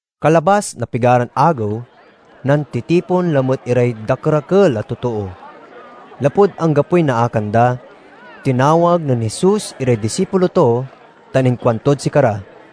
Kalabas na pigaran agew, nantitipon lamet iray dakerakel a totoo. Lapud anggapoy naakan da, tinawag nen Jesus iray disipulo to tan inkuantod sikara,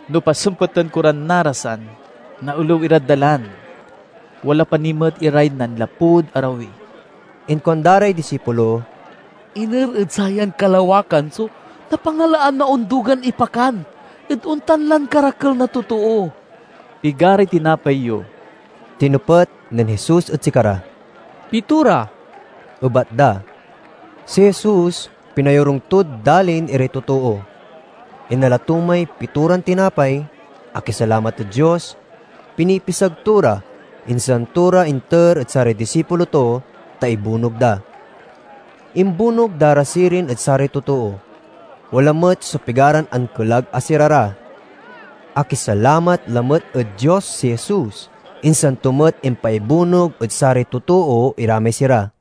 No pasempeten ko ran narasan, naelew irad dalan. Wala pa ni met iray nanlapud arawi." Inkuanda ray disipulo, "Iner ed sayan kalawakan so napangalaan na ondugan ipakan ed ontan lan karakel na totoo?" "Pigaray tinapay yo?" tinepet nen Jesus ed sikara. "Pitora," ebat da. Si Jesus pinayorung tod dalin iray totoo. Inala to may pitoran tinapay, akisalamat ed Dios, pinipisag to ra, insan to ra inter ed saray disipulo to, ta ibunog da. Imbunog da ra sirin ed saray totoo. Wala met so pigaran ankelag a sira ra. Akisalamat lamet ed Dios si Jesus, insan to met impaibunog ed saray totoo ira may sira.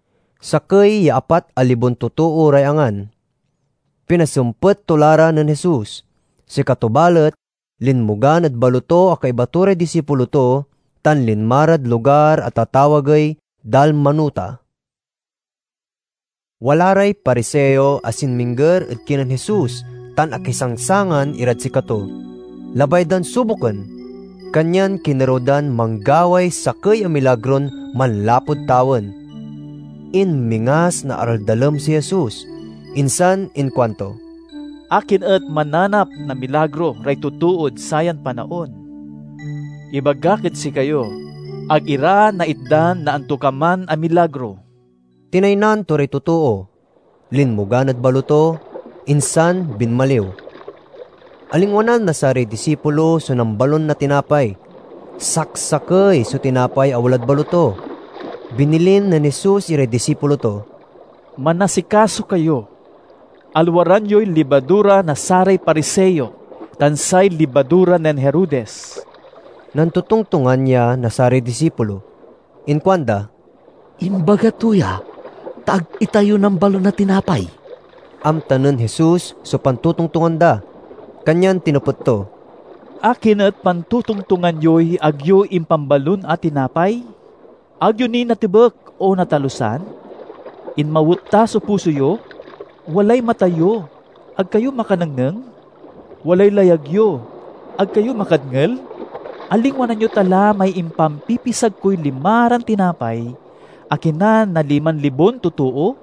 Sakey ya apat a libon totoo ray angan. Pinasempet to la ra nen Jesus. Sikato balet linmogan ed baloto a kaiba to ray disipulo to, tan linma rad lugar a tatawagey Dalmanuta. Wala ray Pariseo a sinmingger ed kinen Jesus tan akisangsangan irad sikato. Labay dan suboken, kanyan kinerew dan manggaway sakey a milagron manlapud tawen. Inmingas na araldalem si Jesus, insan inkuanto, "Akin et mananap na milagro ray totood sayan panaon? Ibagak ed sikayo, ag ira naitdan na antokaman a milagro!" Tinaynan to ray totoo, linmogan ed baloto, insan binmaliw. Alingwanan na saray disipulo so nambalon na tinapay. Saksakey so tinapay a walad baloto. Binilin nen Jesus iray disipulo to, "Manasikaso kayo! Alwaran yoy libadura na saray Pariseo tan say libadura nen Herodes." Nantotongtongan ya na saray disipulo. Inkuanda, "Imbaga to ya, ta ag itayo nambalon na tinapay." Amta nen Jesus so pantotongtongan da, kanyan tinepet to, "Akin et pantotongtongan yoy ag yo impanbalon na tinapay? Ag yo ni natebek o natalusan? Inmawet ta so puso yo? Walay mata yo, ag kayo makanengneng? Walay layag yo, ag kayo makadngel? Alingwanan yo ta la may impampipisag koy limaran tinapay a kinan na liman libon totoo?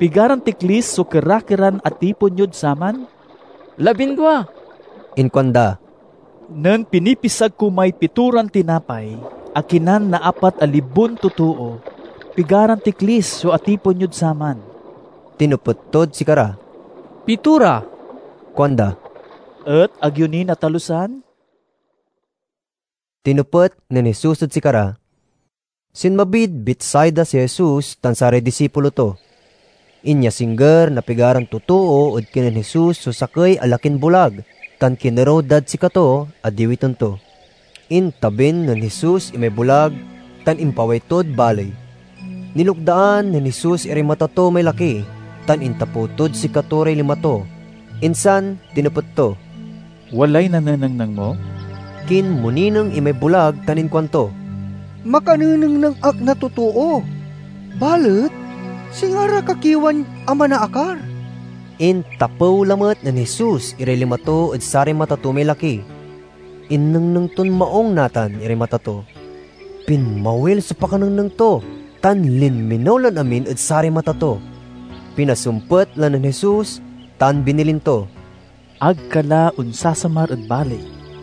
Pigaran tiklis so kera-keran atipon yod saman?" "Labindua," inkuanda. "Nen pinipisag ko may pitoran tinapay a kinan na apat a libon totoo, pigaran tiklis so atipon yod saman?" tinepet tod sikara. "Pitora," kuanda. "Et ag yo ni natalusan?" tinepet nen Jesus ed sikara. Sinmabid Betsaida si Jesus tan saray disipulo to. Inyasingger na pigaran totoo ed kinen Jesus so sakey a lakin bulag, tan kinerew dad sikato a diwiten to. Intabin nen Jesus imay bulag tan impaway tod baley. Nilukdaan nen Jesus iray mata to may laki tan intapew tod sikato ray lima to, insan tinepet to, "Walay nanenengneng mo?" Kinmonineng imay bulag tan inkuanto, "Makanenengneng ak na totoo, balet singa ra kakiewan a manaakar." Intapew lamet nen Jesus iray lima to ed saray mata to may laki. Innengneng ton maung natan iray mata to. Pinmawil so pakanengneng to, tan linminew lan amin ed saray mata to. Pinasempet la nen Jesus tan binilin to, "Ag ka la onsasamar ed baley."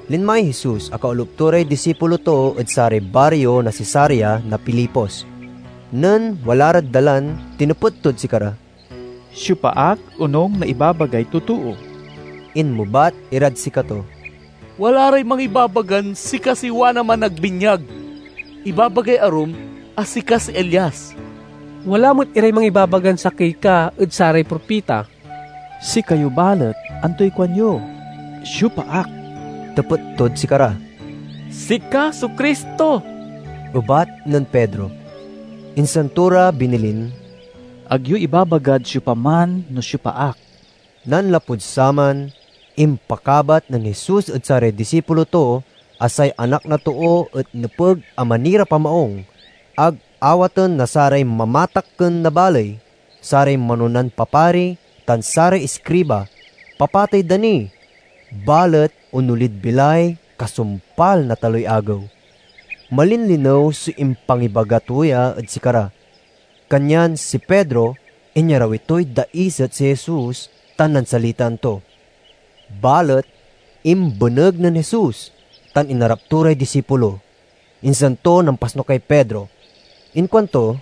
Linmay Jesus a kaolup to ray disipulo to ed saray bario na Cesarea na Filipos. Nen wala rad dalan tinepet tod sikara, "Siopa ak, onung na ibabagay totoo?" Inmebat irad sikato, "Wala ray mangibabagan sika si Juan a Managbinyag. Ibabagay arum a sika si Elias; wala met iray mangibabagan sakey ka ed saray propita." "Sikayo balet, antoy kuanyo? Siopa ak?" tepet tod sikara. "Sika so Cristo," ebat nen Pedro. Insan to ra binilin, "Ag yo ibabagad siopaman no siopa ak." Nanlapud saman, impakabat nen Jesus ed saray disipulo to a say Anak na Too et nepeg a manirap a maung; ag awaten na saray mamatakken na baley, saray manonan papari, tan saray iskriba; papatey da ni, balet onolid bilay kasumpal na taloy agew. Malinlinew so impangibaga to ya ed sikara, kanyan si Pedro inyarawi toy daiset si Jesus tan nansalitaan to. Balet imbeneg nen Jesus tan inarap to ray disipulo, insan to nampasnukay Pedro. Inkuanto,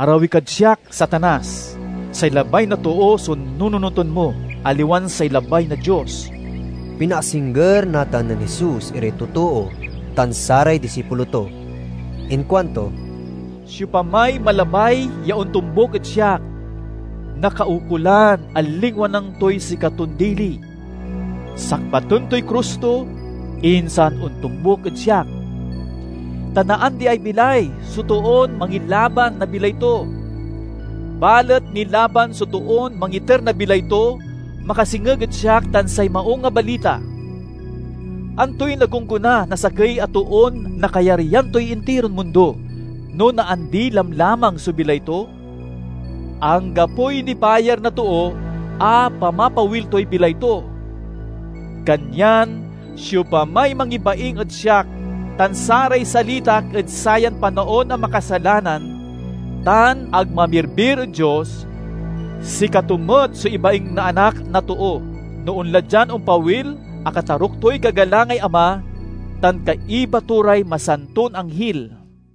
"Arawi kad siak, Satanas! Say labay na too so nununoten mo, aliwan say labay na Dios." Pinaasingger natan nen Jesus iray totoo tan saray disipulo to. Inkuanto, "Siopamay malabay ya ontombuk ed siak, nakaukolan a lingwanan toy sikaton dili, sakbaten toy krus to, insan ontombuk ed siak. Ta naandiay bilay so toon mangilaban na bilay to; balet nilaban so toon mangiter na bilay to makasengeg ed siak tan say Maung a Balita. Antoy nagonggona na sakey a toon nakayaryan toy intiron mundo, no naandi lamlamang so bilay to? Anggapoy nibayar na too a pamapawil toy bilay to! Kanyan siopamay mangibaing ed siak tan saray salitak ed sayan panaon a makasalanan tan ag mamirbir ed Dios, sikato met so ibaing na Anak na Too, no onla dian ompawil a kataruk toy kagalangay Ama tan kaiba to ray masanton anghil."